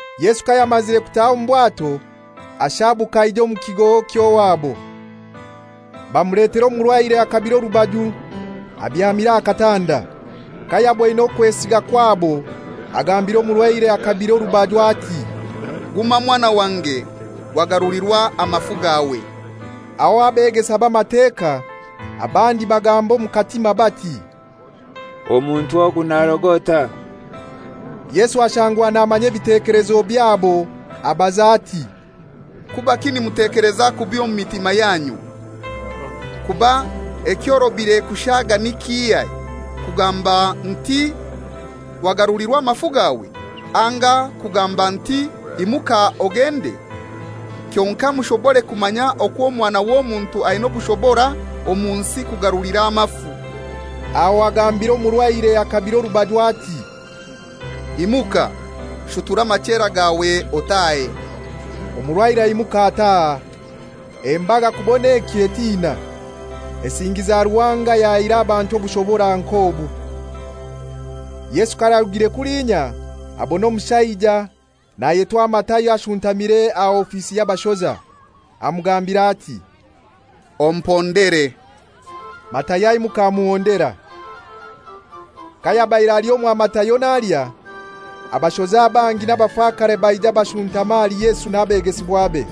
Yesu kayamazire kutaha omu bwato ashaabuka aija omu kigo ky'owabo. Bamuletera omurwaire akabire orubaju abyamire aha katanda. Kayaboine okwesiga kwabo agambira omurwaire akabire orubaju ati, «Guma mwana wange, wagarulirwa amafu gawe.» Aho abegesa b'Amateka abandi bagamba omu katima bati, «Omuntu ogu narogota.» Yesu ashangwa namanya ebitekelezo byabo abaza ati, «Kubaki nimutekeleza kubi omu mitima yanyu? Kuba ekyorobire kushaga ni kihai, kugamba nti, ‹Wagarulirwa amafu gawe,› anga kugamba nti, ‹Imuka ogende?› Kyonkai mushobore kumanya okwo Omwana w'Omuntu aina obushobora omu nsi kugarulira amafu,» aho agambira omurwaire akabire orubaju ati, «Imuka, shutura amachera gawe otahe.» Omurwaire aimuka ataha. Embaga kubon'ekyo etina, esingiza Ruhanga ayahaire abantu obushobora nk'obu. Yesu kayarugiire kulinya, abona omushaija nayetwa Matayo ashuntamire aha ofisi y'abashoza. Amugambira ati, «Ompondere.» Matayo aimuka amuhondera. Kayabaire ali omwa Matayo nalya, abashoza bangi n'abafakare baija bashuntama ahali Yesu n'abegesibwabe.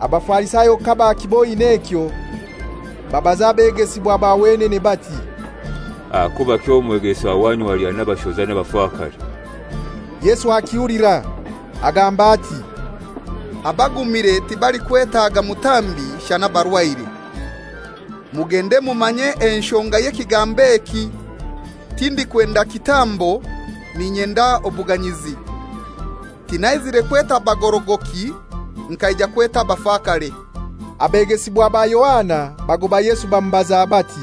Abafarisayo kabakiboine ekyo, babaza abegesibwa ba wenene bati, «Ahakubaki omwegesa wanyu alya n'abashoza n'abafakare?» Yesu akihulira! Agamba ati, «Abagumire tibalikwetaga mutambi shana abarwaire. Mugende mumanye enshonga y'ekigambo eki, ‹Tindikwenda kitambo, n'inyenda obuganyizi.› Tinaizire kweta bagorogoki, nkaija kweta abafakare.» Abegesibwa ba Yohana bagoba Yesu bamubaza bati,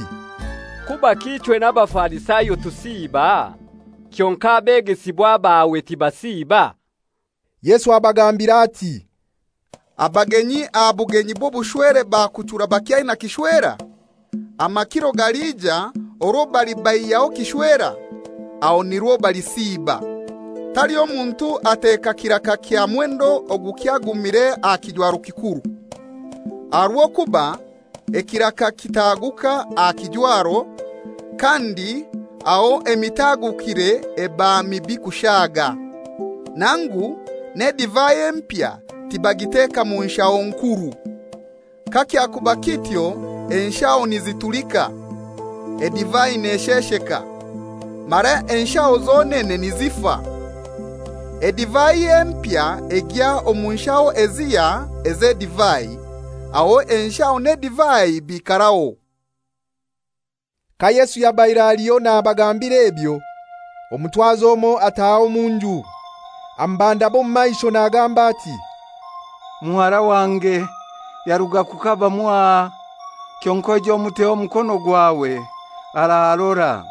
«Kubaki ichwe n'Abafarisayo tusiiba, kyonkai abegesibwa bawe tibasiiba?» Yesu abagambira ati, «Abagenyi aha bugenyi bw'obushwere bakuchura bakyaina kishwera? Amakiro galija orwo balibaihyaho kishwera, aho nirwo balisiiba. Taliho muntu ateeka kiraka kya mwendo ogukyagumire aha kijwaro kikuru, aha rw'okuba ekiraka kitaguka aha kijwaro, kandi aho emitagukire eba mibi kushaga. Nangu n'edivai empya tibagiteka mu nshaho nkuru. Kakyakuba kityo enshaho nizitulika, edivai neshesheka, mara enshaho zonene nizifa. Edivai empya egya omu nshaho ezihya ez'edivai, aho enshaho n'edivai biikaraho.» Ka Yesu yabaire aliho nabagambira ebyo, omutwazi omoi ataha omu nju amubandama omu maisho nagamba ati, «Muhara wange yaruga kukaba mwaha; kyonkai oije omuteho omukono gwawe, ararora.»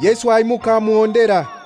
Yesu aimuka amuhondera.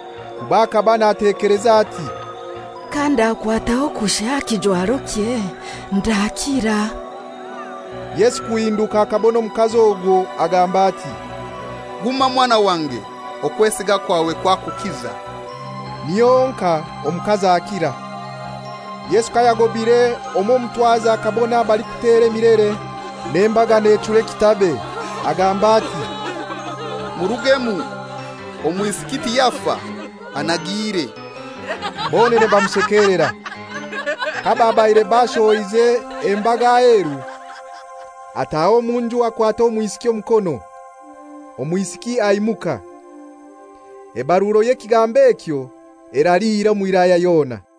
kuba akaba natekeleza ati, «Kandakwataho kushai aha kijwarokye ndakira.» Yesu kuhinduka akabona omukazi ogwo, agamba ati, «Guma mwana wange; okwesiga kwawe kwakukiza.» Niho honkai omukazi akira. Yesu kayagobire omw'omutwazi, akabona abalikutera emilere n'embaga nechura ekitabe, agamba ati, «Murugemu, omwisiki tiyafa, anagiire.» Bonene bamushekelera. Kababaire bashohoize embaga aheru, ataha omu nju, akwata omwisiki omukono, omwisiki aimuka. Ebaruro y'ekigambo ekyo eraliira omu Wilaya yona.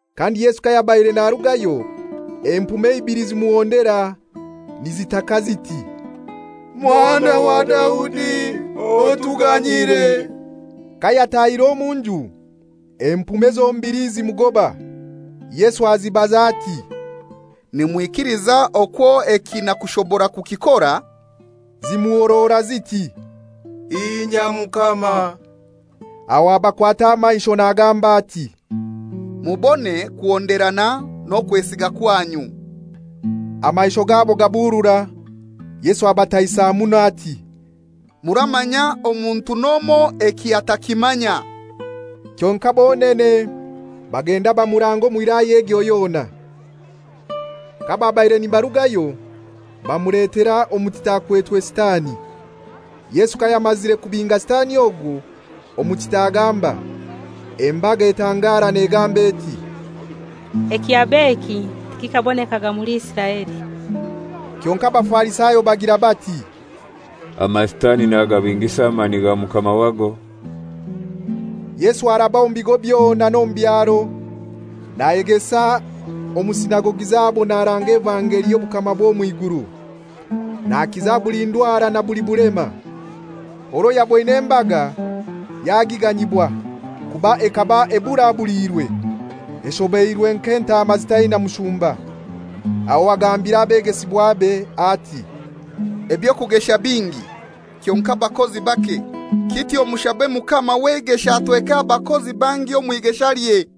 Kandi Yesu kayabaire narugayo, empume ibili zimuhondera, nizitaka ziti, «Mwana wa Daudi otuganyire.» Kayatahire omu nju empume zombili zimugoba. Yesu azibaza ati, «Nimwikiliza okwo eki nakushobora kukikora?» Zimuhorora ziti, «Inya Mukama.» Aho abakwata amaisho nagamba ati, «Mubone kuhonderana n'okwesiga kwanyu.» Amaisho gabo gaburura. Yesu abataisa muno ati, «Muramanya omuntu n'omoi eki atakimanya.» Kyonkai bonene bagenda bamuranga omu wilaya egyo yona. Kababaire nibarugayo bamuletera omutita akwetwe sitani. Yesu kayamazire kubinga sitani ogwo, omutita agamba. Embaga etangara negamba eti, «Ekyab'eki tikikabonekaga muli Isiraeli.» Kyonkai Abafarisayo bagira bati, «Amasitani nagabingisa amani ga mukama wago.» Yesu araba omu bigo byona n'omu byaro nayegesa omu sinagogi zabo naranga evangeli y'obukama bw'omw'iguru, nakiza buli ndwara na buli bulema. Orwo yaboine embaga yagiganyibwa, kuba ekaba eburabuliirwe, eshobeirwe nk'entaama ezitaina mushumba. Aho agambira abegesibwabe ati, «Eby'okugesha bingi, kyonkai abakozi bake. Kityo mushabe Mukama w'eigesha atweke abakozi bangi omw'igeshalye.»